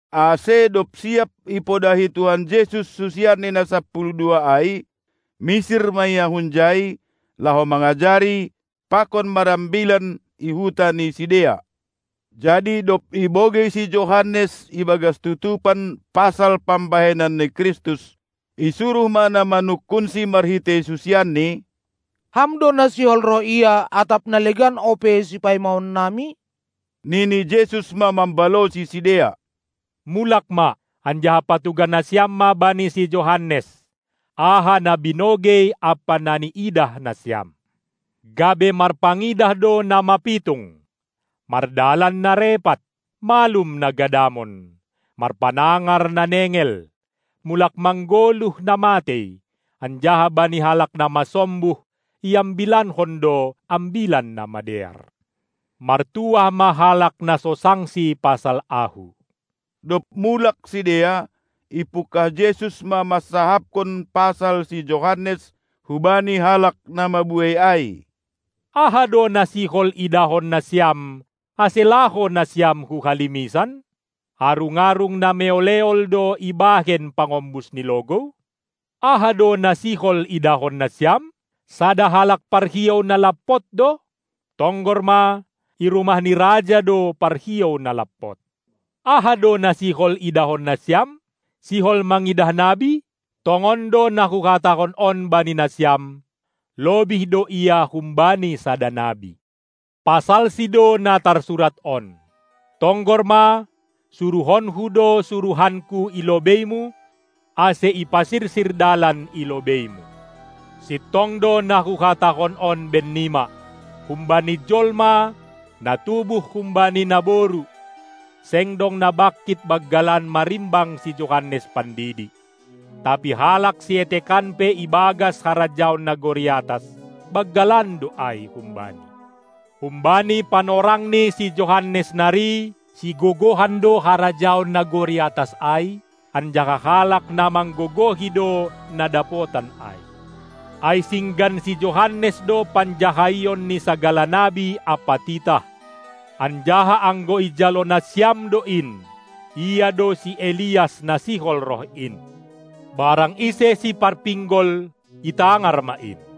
Ase dob siap ipodahi Tuhan Jesus susianNi na sapuluh dua ai, misir ma Ia hunjai, laho mangajari pakon marambilan i huta ni sidea. Jadi dob ibogei si Johannes ibagas tutupan pasal pambahenan ni Kristus, isuruh ma na manungkunsi marhitei susianNi: Ham do na sihol roh ia, atap na legan ope sipaimaonnami? Nini Jesus ma mambalosi sidea: Mulak ma, anjaha patugah nasiam ma bani si Johannes, aha na binogei ampa na niidah nasiam: Gabe marpangidah do na mapitung, mardalan na repat, malum na gadamon, marpanangar na nengel, mulak manggoluh na matei, anjaha bani halak na masombuh iambilankon do ambilan na madear. Martuah ma halak na so sangsi pasal Ahu. Dob mulak sidea, ipungkah Jesus ma mansahapkon pasal si Johannes hubani halak na mabuei ai: Aha do na sihol idahon nasiam, ase laho nasiam hu halimisan? Arung-arung na meol-eol do ibahen pangombus ni logou? Aha do na sihol idahon nasiam? Sada halak parhiou na lampot do? Tonggor ma, i rumah ni raja do parhiou na lampot. Aha do na sihol idahon nasiam? Sihol mangidah nabi? Tongon do na Huhatahon on bani nasiam, lobih do Ia humbani sada nabi. Pasalsi do na tarsurat on: Tonggor ma, suruhonKu do suruhanKu i lobeiMu, ase ipasirsir dalan i lobeiMu. Sintong do na Huhatahon on bennima: Humbani jolma, na tubuh humbani naboru, seng dong na bangkit banggalan marimbang si Johannes Pandidi; tapi halak sietekan pe ibagas harajaon nagori atas, banggalan do ai humbani. Humbani panorang ni si Johannes nari sigogohan do harajaon nagori atas ai, anjaha halak na manggogohi do na dapotan ai. Ai singgan si Johannes do panjahaion ni sagala nabi ampa titah; anjaha anggo ijalo nasiam do in, ia do si Elias na sihol roh in. Barang ise siparpinggol, itangar ma in!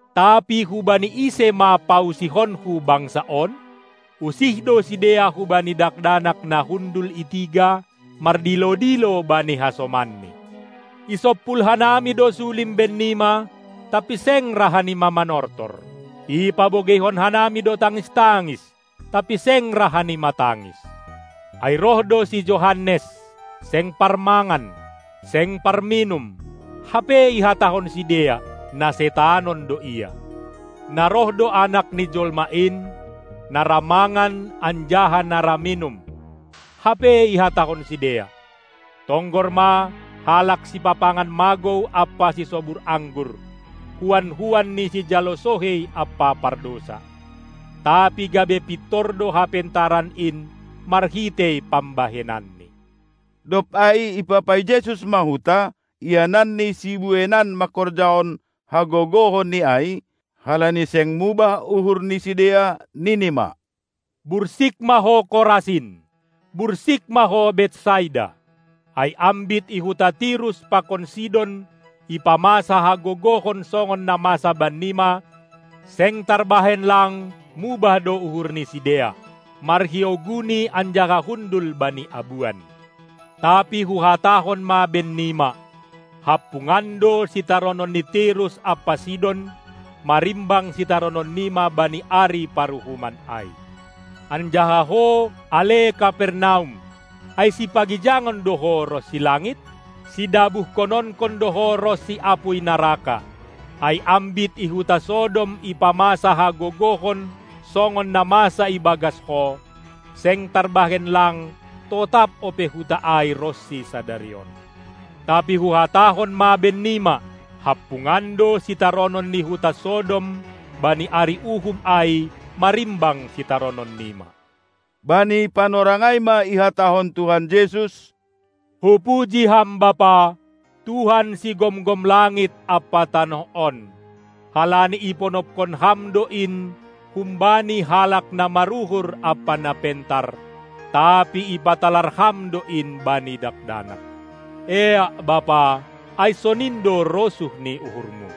Tapi hubani ise ma pausihonKu bangsa on? Usih do sidea hubani dakdanak na hundul i tiga, mardilo-dilo bani hasomanni: Isompul hanami do sulim bennima tapi seng ra hanima manortor, ipabogeihon hanami do tangis-tangis, tapi seng ra hanima tangis. Ai roh do si Johannes, seng parmangan, seng parminum, hape ihatahon sidea: Na setanon do ia. Na roh do Anak ni jolma in, na ra mangan anjaha na ra minum, hape ihatahon sidea: Tonggor ma, halak sipapangan magou ampa sisobur anggur, huan-huan ni sijalo sohei ampa pardousa! Tapi gabe pintor do Hapentaran in marhitei pambahenanNi. Dob ai ipapai Jesus ma huta, iananNi sibueinan mangkorjahon hagogohonNi ai, halani seng mubah uhur ni sidea, nini ma: Bursik ma ho Korasin! Bursik ma ho Betsaida! Ai ambit i huta Tirus pakon Sidon ipamasa hagogohon songon na masa bannima, seng tarbahen lang mubah do uhur ni sidea, marhiou guni anjaha hundul bani abuan. Tapi Huhatahon ma bennima: Hampungan do sitaronon ni Tirus ampa Sidon marimbang sitarononnima bani ari paruhuman ai. Anjaha ho, ale Kapernaum, ai sipagijangon do ho ronsi langit? Sidabuhkononkon do ho ronsi apuy naraka. Ai ambit i huta Sodom ipamasa hagogohon songon na masa ibagas ho, seng tarbahen lang totap ope huta ai ronsi sadari on. Tapi Huhatahon ma bennima: Hampungan do sitaronon ni huta Sodom bani ari uhum ai marimbang sitarononnima! Bani panorang ai ma ihatahon Tuhan Jesus: Hupuji Ham Bapa, Tuhan sigomgom langit ampa tanoh on, halani iponopkon Ham do in humbani halak na maruhur ampa na pentar, tapi ipatalar Ham do in bani dakdanak. Eak, Bapa, ai sonin do rosuh ni uhurmu.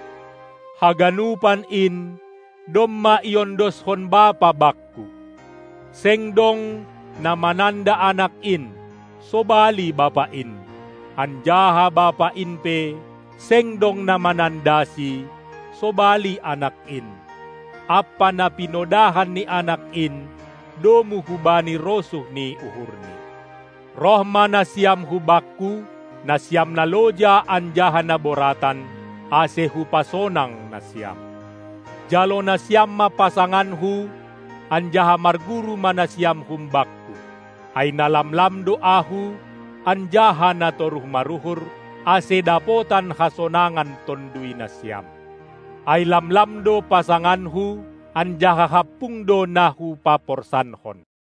Haganupan in, domma iondoskon Bapa Bakku; seng dong, na mananda Anak in, sobali Bapa in, anjaha Bapa in pe, seng dong na manandaSi, sobali Anak in, ampa na pinodahan ni Anak in, domu hubani rosuh ni uhurNi. Roh ma nasiam hu Bakku, nasiam na loja anjaha na boratan, ase Hupasonang nasiam. Jalo nasiam ma pasanganKu anjaha marguru ma nasiam hum Bakku, ai na lamlam do Ahu anjaha na toruh maruhur, ase dapotan hasonangan tonduy nasiam. Ai lamlam do pasanganKu, anjaha hampung do na Hupaporsankon.